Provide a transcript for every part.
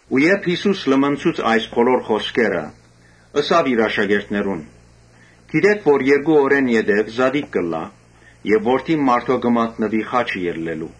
Երբ Յիսուս լմնցուց այս բոլոր խօսքերը, ըսաւ իր աշակերտներուն. «Գիտէք թէ երկու օր յետոյ զատիկ պիտի ըլլայ եւ Որդին մարդոյ պիտի մատնուի խաչը ելլելու»։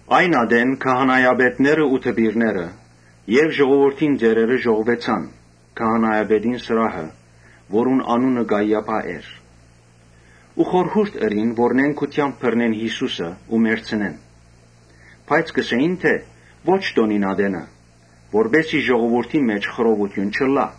Նոյն ատեն քահանայապետները ու դպիրները եւ ժողովուրդին ծերերը ժողուեցան քահանայապետին սրահը, որուն անունը Կայիափա էր Ու խորհեցան նենգութեամբ բռնել Յիսուսը ու մեռցնել։ Բայց կ’ըսէին թէ՝ «Ո՛չ տօնին ատենը, որպէս զի ժողովուրդին մէջ խռովութիւն չըլլայ»։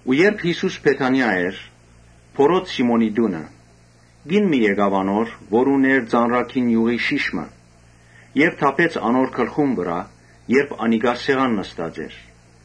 Երբ Յիսուս Բեթանիա էր, բորոտ Սիմոնին տունը, Կին մը եկաւ անոր։ Ան ունէր ծանրագին իւղի շիշ մը։ Իւղը թափեց Յիսուսի գլխուն վրայ՝ երբ ան սեղան նստած էր։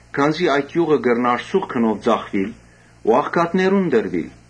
Քանզի այդ իւղը կրնար սուղ գնով ծախուիլ ու աղքատներուն տրուիլ»։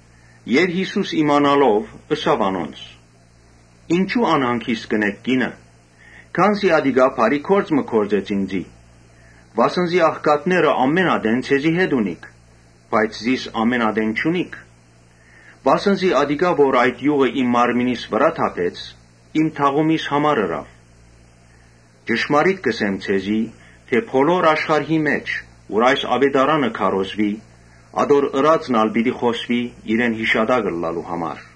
Յիսուս իմանալով՝ ըսաւ անոնց. «Ինչո՞ւ անհանգիստ կ’ընէք կինը։ Անիկա բարի գործ մը գործեց։ Վասն զի աղքատները ամէն ատեն ձեզի հետ ունիք, բայց զիս ամէն ատեն չունիք։ Անիկա, որ այդ իւղը իմ մարմնիս վրայ թափեց, իմ թաղումիս համար ըրաւ։ Ճշմարիտ կ’ըսեմ ձեզի թէ՝ Բոլոր աշխարհի մէջ՝ ուր որ այս աւետարանը քարոզուի, ատոր ըրածն ալ պիտի պատմուի՝ իրեն յիշատակ ըլլալու համար»։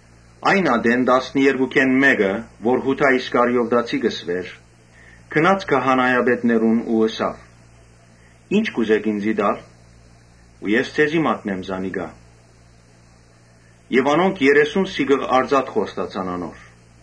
Այն ատեն տասներկուքէն մէկը, որ Յուդա Իսկարիովտացի կը կոչուէր, գնաց քահանայապետներուն ու ըսաւ. «Ի՞նչ կու տաք ինծի, որ ձեզի մատնեմ զանիկա»։ Անոնք երեսուն սիկղ արծաթ Կամ, կշռեցինխոստացան անոր։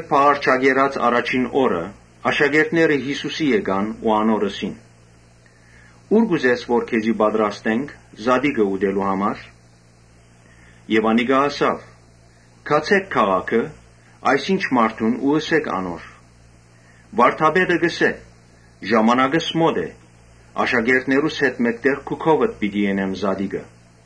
Բաղարջակերաց առաջին օրը աշակերտները Յիսուսին եկան, անոր ըսին. «Ո՞ւր կուզես որ քեզի պատրաստենք զատիկը՝ ուտելու համար»։ Անիկա ըսաւ. «Գացէք քաղաքը այս ինչ մարդուն ու ըսէք անոր, Վարդապետը կ’ըսէ. ‘Ժամանակս մօտ է. աշակերտներուս հետ մէկտեղ քու քովդ պիտի ընեմ զատիկը’»։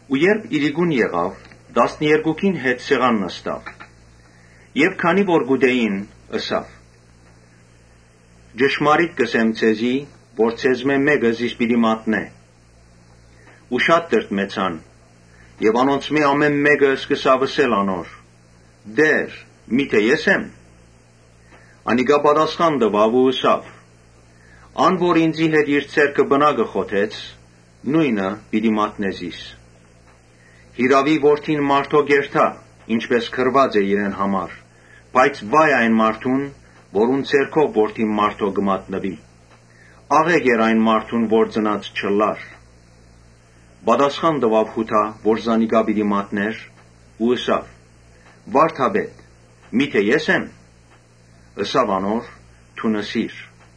Իրիկունը տասներկուքին հետ սեղան նստաւ։ Երբ կ’ուտէին, ըսաւ. «Ճշմարիտ կ’ըսեմ ձեզի թէ ձեզմէ մէկը զիս պիտի մատնէ»։ Շատ տրտմեցան եւ անոնցմէ ամէն մէկը սկսաւ ըսել անոր. «Տէ՛ր, միթէ ե՞ս եմ»։ Անիկա պատասխան տուաւ ու ըսաւ. «Ան որ ինծի հետ իր ձեռքը պնակը խոթեց, նոյնը պիտի մատնէ զիս»։ Յիրաւի Որդին մարդոյ կ’երթայ, ինչպէս գրուած է իրեն համար. բայց վա՜յ այն մարդուն, որուն ձեռքով Որդին մարդոյ կը մատնուի։ Աղէկ էր այն մարդուն որ ծնած չըլլար»։ Պատասխան տուաւ Յուդա, որ զանիկա պիտի մատնէր ու ըսաւ. «Վա՛րդապետ, միթէ ե՞ս եմ»։ Ըսաւ անոր. «Դուն ըսիր»։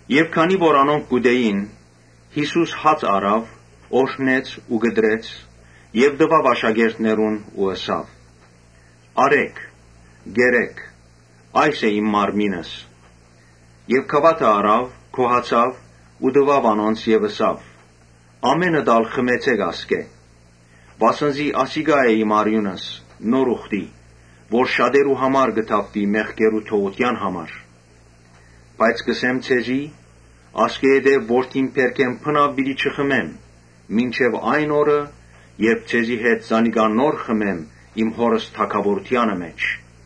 Մինչ անոնք կ’ուտէին, Յիսուս հացը առաւ, օրհնեց ու կտրեց եւ տուաւ աշակերտներուն ու ըսաւ. «Առէ՛ք, կերէ՛ք, այս է իմ մարմինս»։ Եւ գաւաթը առաւ, գոհացաւ ու տուաւ անոնց ու ըսաւ. «Ամէնքդ ալ խմեցէ՛ք ասկէ. վասն զի ասիկա է իմ արիւնս նոր ուխտի, որ պիտի թափուի՝ շատերու մեղքերուն թողութեան համար։ Բայց կ’ըսեմ ձեզի, ‘Ասկէ յետոյ որթին բերքէն բնաւ պիտի չխմեմ, մինչեւ այն օրը՝ երբ ձեզի հետ նոր գինին խմեմ իմ Հօրս թագաւորութեանը մէջ’»։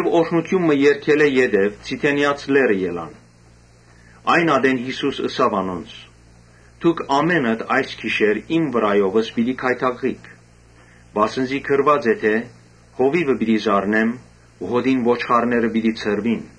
Օրհնութիւն մը երգելէ յետոյ Ձիթենեաց լեռը ելան։ Այն ատեն Յիսուս ըսաւ անոնց. «Դուք ամէնքդ այս գիշեր իմ վրայովս պիտի գայթակղիք. վասն զի գրուած է թէ ‘Հովիւը պիտի զարնեմ ու հօտին ոչխարները պիտի ցրուին’։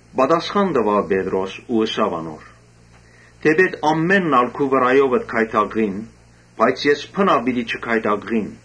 Պատասխան տուաւ Պետրոս ու ըսաւ անոր. «Թէպէտ ամէնքն ալ քու վրայովդ գայթակղին, ես բնա՛ւ պիտի չգայթակղիմ»։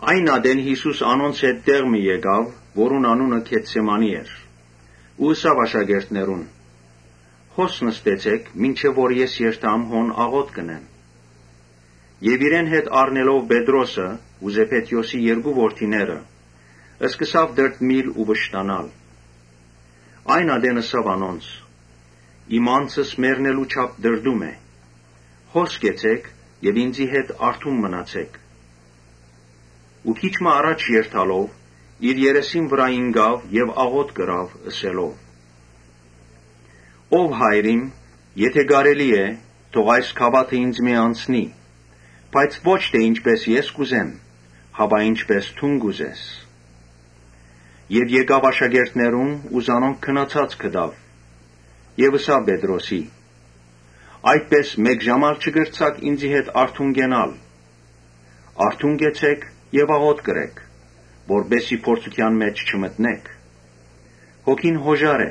Այն ատեն Յիսուս անոնց հետ տեղ մը գնաց, որուն անունը Գեթսեմանի էր ու ըսաւ աշակերտներուն. «Հոս նստեցէք մինչեւ որ ես երթամ հոն աղօթք ընեմ»։ Իրեն հետ առնելով Պետրոսը ու Զեբեդէոսի երկու որդիները, սկսաւ տրտմիլ ու վշտանալ։ Այն ատեն ըսաւ անոնց. «Իմ անձս մեռնելու չափ տրտում է։ Հոս կեցէք եւ ինծի հետ արթուն մնացէք»։ Ու քիչ մը առջեւ երթալով՝ իր երեսին վրայ ինկաւ եւ աղօթք ըրաւ՝ ըսելով. «Ով Հայր իմ, եթէ կարելի է, թող այս գաւաթը ինծմէ անցնի. բայց ո՛չ թէ ինչպէս ես կ՛ուզեմ, հապա ինչպէս դուն կ’ուզես»։ Երբ եկաւ աշակերտներուն, զանոնք քնացած գտաւ եւ ըսաւ Պետրոսին. «Այդպէս մէկ ժա՞մ ալ չկրցաք ինծի հետ արթուն կենալ։ Արթուն կեցէք եւ աղօթք ըրէք, որպէս զի փորձութեան մէջ չմտնէք։ Հոգին յօժար է,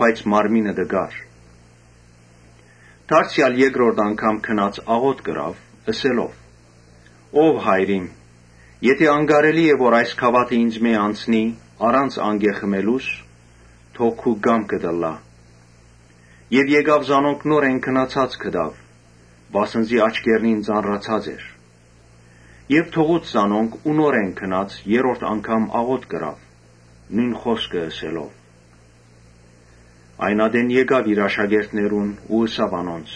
բայց մարմինը տկար»։ Դարձեալ երկրորդ անգամ գնաց աղօթք ըրաւ՝ ըսելով. «Ով Հայր իմ, եթէ անկարելի է որ այս գաւաթը ինծմէ անցնի առանց անկէ խմելու՝ թող քու կամքդ ըլլայ»։ Եւ եկաւ զանոնք նորէն քնացած գտաւ, վասն զի աչքերնին ծանրացած էր։ Թողուց զանոնք ու նորէն գնաց՝ երրորդ անգամ աղօթք ըրաւ՝ նոյն խօսքը ըսելով։ Այն ատեն եկաւ իր աշակերտներուն ու ըսաւ անոնց.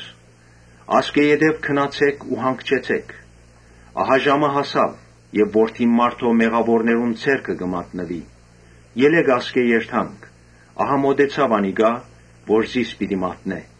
«Ասկէ յետոյ քնացէք ու հանգչեցէք. ահա ժամը հասաւ եւ Որդին մարդոյ մեղաւորներուն ձեռքը պիտի մատնուի։ Ելէք ասկէ երթանք. ահա մօտեցաւ անիկա որ զիս պիտի մատնէ»։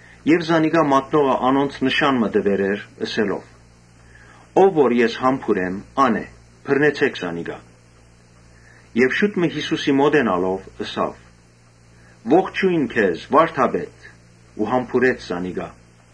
Զանիկա մատնողը անոնց նշան մը տուեր էր՝ ըսելով. «Ով որ ես համբուրեմ, ա՛ն է, բռնեցէք զանիկա»։ Եւ շուտ մը Յիսուսին մօտենալով՝ ըսաւ. «Ողջոյն քեզ, վա՛րդապետ», ու համբուրեց զանիկա։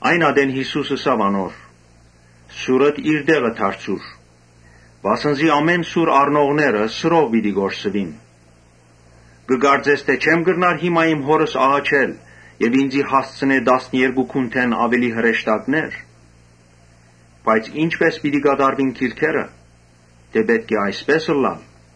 Այն ատեն Յիսուս ըսաւ անոր. «Սուրդ տե՛ղը դարձուր, վասն զի բոլոր սուր առնողները՝ սուրով պիտի կորսուին։ Կը կարծես թէ չե՞մ կրնար հիմա իմ Հօրս աղաչել, որ ինծի հասցնէ տասներկու Յուն., լեգէոնէնգունդէն աւելի հրեշտակներ։ Բայց ի՞նչպէս պիտի կատարուին գրուածները, թէ պէտք է այսպէս ըլլայ»։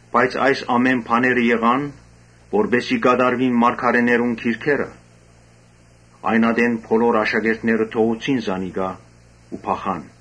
Բայց այս ամէն բաները եղան, որպէս զի կատարուին մարգարէներուն գրքերը»։ Այն ատեն բոլոր աշակերտները թողուցին զանիկա ու փախան։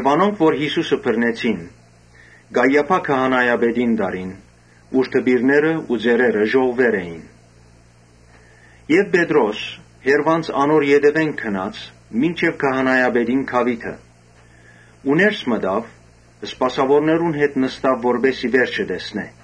Անոնք որ Յիսուսը բռնեցին, Կայիափա քահանայապետին տարին, ուր դպիրները ու ծերերը ժողվուեր էին։ Պետրոս հեռուէն անոր ետեւէն գնաց մինչեւ քահանայապետին գաւիթը ու ներս մտաւ, սպասաւորներուն հետ նստաւ, որպէս զի վերջը տեսնէ։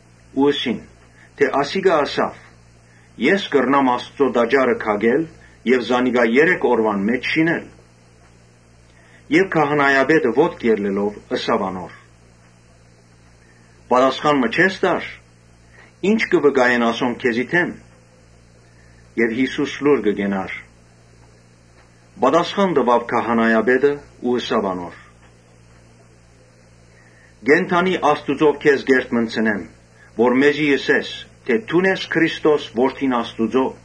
Ու ըսին թէ՝ «Ասիկա ըսաւ, ‘Ես կրնամ Աստուծոյ տաճարը քակել եւ զանիկա երեք օրուան մէջ շինել’»։ Քահանայապետը ոտքի ելլելով՝ ըսաւ անոր. «Պատասխան մը չե՞ս տար. ի՞նչ կը վկայեն ասոնք քեզի դէմ»։ Յիսուս լուռ կեցաւ։ Ուստի ելաւ քահանայապետը ու ըսաւ անոր. «Կենդանի Աստուծմով քեզ կ’երդմնցնեմ, որ մեզի ըսես, թէ դո՞ւն ես Քրիստոսը՝ Որդին Աստուծոյ»։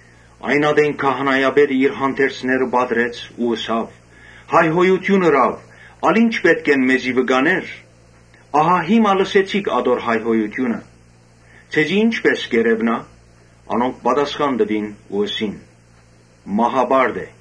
Այն ատեն քահանայապետը իր հանդերձները պատռեց ու ըսաւ. «Հայհոյութիւն ըրաւ. ալ ի՞նչ պէտք են մեզի վկաներ. ահա հիմա լսեցիք ատոր հայհոյութիւնը. Ձեզի ի՞նչպէս կ’երեւնայ»։ Անոնք պատասխան տուին ու ըսին. «Մահապարտ է»։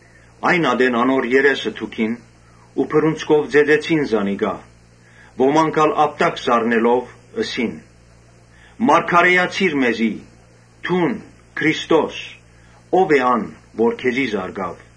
Այն ատեն անոր երեսը թքնեցին, բռունցքով ծեծեցին զանիկա։ Ոմանք ալ ապտակ զարնելով՝ ըսին. ‘Մարգարէացիր մեզի, դո՛ւն, Քրիստո՛ս, ո՞վ է ան որ քեզի զարկաւ’»։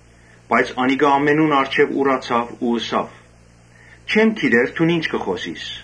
Բայց անիկա ամենուն առջեւ ուրացաւ ու ըսաւ. «Չեմ գիտեր դուն ի՛նչ կը խօսիս»։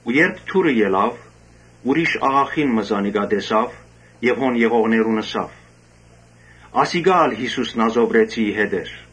Երբ դուռը ելաւ, ուրիշ աղախին մը զանիկա տեսաւ եւ հոն եղողներուն ըսաւ. «Ասիկա ալ Յիսուս Նազովրեցիին հետ էր»։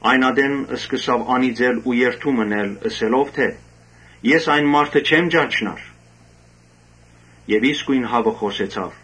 Այն ատեն սկսաւ անիծել ու երդում ընել՝ ըսելով թէ՝ ‘Ես այն մարդը չեմ ճանչնար’։ Նոյն պահուն հաւը խօսեցաւ։